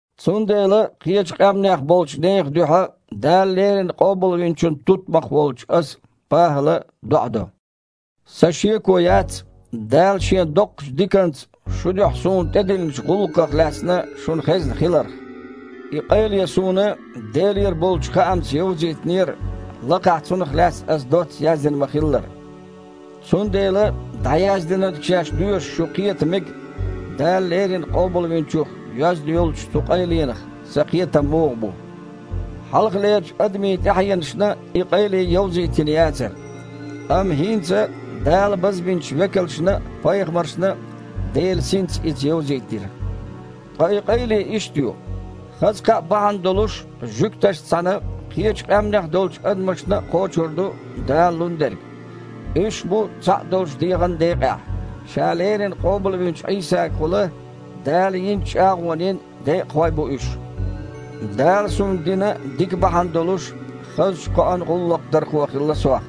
Цундела кхечу къаьмнех болчу нехан дуьхьа Дала леррина къобалвинчун тутмакх волчу аса, ПахІала, доІа до. Сан шеко яц, Дала Шен доккхачу диканца шун дуьхьа суна тІедиллинчу гІуллакхах лаьцна шуна хезна хиларх. И къайле суна Делера болчу хаамца йовзийтинера, лакхахь цунах лаьцна аса доцца яздина ма-хиллара. Цундела, дІаяздинарг шаьш доьшуш, шу кхета мега, Дала леррина къобалвинчух йоьзна йолчу цу къайленах сан кхетам муха бу. Хьалхалерчу адамийн тІаьхьенашна и къайле йовзийтина яцара. Амма хІинца Дала базбинчу векалшна а, пайхамаршна а Делан Синца иза йовзийтира. Ткъа и къайле иштта ю: хаза кхаъ бахьана долуш, жуьгташца цхьаьна кхечу къаьмнех долчу адамашна а кхочур ду Дала лун дерг, уьш а бу цхьаъ долчу дегІан декъехь, Ша леррина къобалвинчу Іийсагахула Дала йинчу чІагІонийн декъахой а бу уьш. Дала суна дина дика бахьана долуш, хазачу кхоан гІуллакхдархо хилла сох.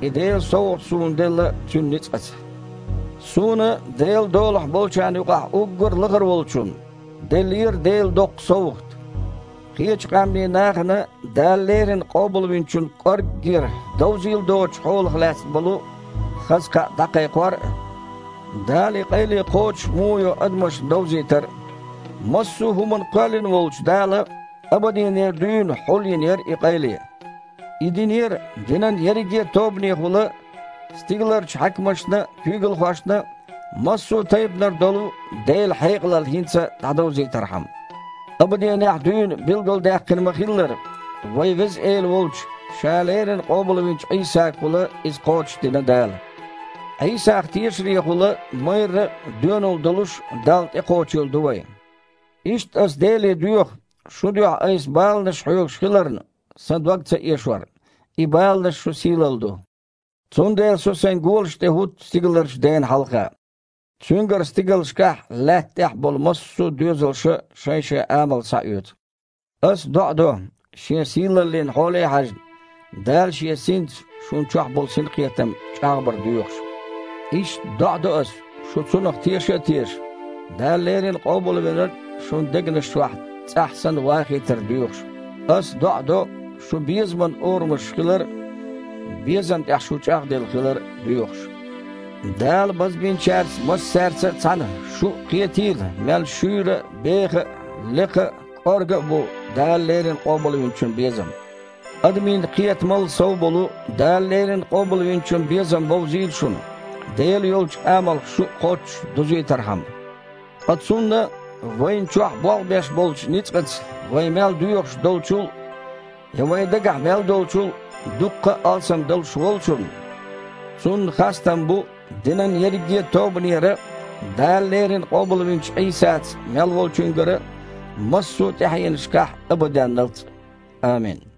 И Делан совгІат суна делла Цуьнан ницкъаца. Суна, Делан долахь болчарна юкъахь уггар а лахара волчунна, деллера Делан доккха совгІат: кхечу къаьмнийн нахана Дала леррина Къобалвинчун кІорггера довзийла доцучу хьолах лаьцна болу хаза кхаъ дІакхайкхор а, Дала и къайле кхочуш муха йо адамашна довзийтар а. Массо а хІума кхоьллина волчу Дала абаденера дуьйна хьулйина яра и къайле. И динера, динан ерриге а тобанехула стигаларчу хьаькамашна а, куьйгалхошна а массо а тайпанара долу Делан хьекъалалла хІинца дІадовзийтархьама. Абаденехь дуьйна билгалдаьккхина ма-хиллара, вайн Веза Эла волчу, Ша леррина къобалвинчу Іийсагахула иза кхочушдина Дала. Іийсах тешарехула майрра а, доьналла долуш а Далла тІекхочийла ду вайн. Иштта ас Деле доьху, шун дуьхьа айса баланаш хьоьгуш хиларна, сан дог ца эшор. И баланаш – шун сийлалла ду. Цундела со сайн голашна тІе хІутту стигаларчу Дена хьалха. Цуьнгара стигалшкахь а, лаьтта тІехь а болу массо а доьзалша шайн-шайн амал схьаоьцу. Ас доІа до, Шен сийлаллин хьоле а хьаьжна, Дала Шен Синца шун чохь болу синкхетам чІагІбар доьхуш. Иштта доІа до ас, шу Цунах теша а тешаш, Дала леррина Къобалвинарг шун дегнаш чохь, цІахь санна, вахийтар доьхуш. Ас доІа до, шун безаман орамаш хилар а, безам тІехь шу чІагІделла хилар а доьхуш. Дала базбинчаьрца массаьрца а цхьаьна шу а кхетийла мел шуьйра а, беха а, лекха а, кІорга а бу Дала леррина Къобалвинчун безам. Адамийн кхетамал сов болу Дала леррина Къобалвинчун безам бовзийла шуна, Делан йолчу амалх шу а кхоччуш дузийтархьама. Ткъа Цунна, вайна чохь болх беш болчу ницкъаца вай мел доьхуш долчул а, я вайн дагахь мел долчул а дуккха а алсам далуш Волчунна, Цунна хастам бу динан ерриге а тобанера а, Дала леррина къобалвинчу Іийсаца мел волчуьнгара а массо а тІаьхьенашкахь а, абаденналц а! Амин.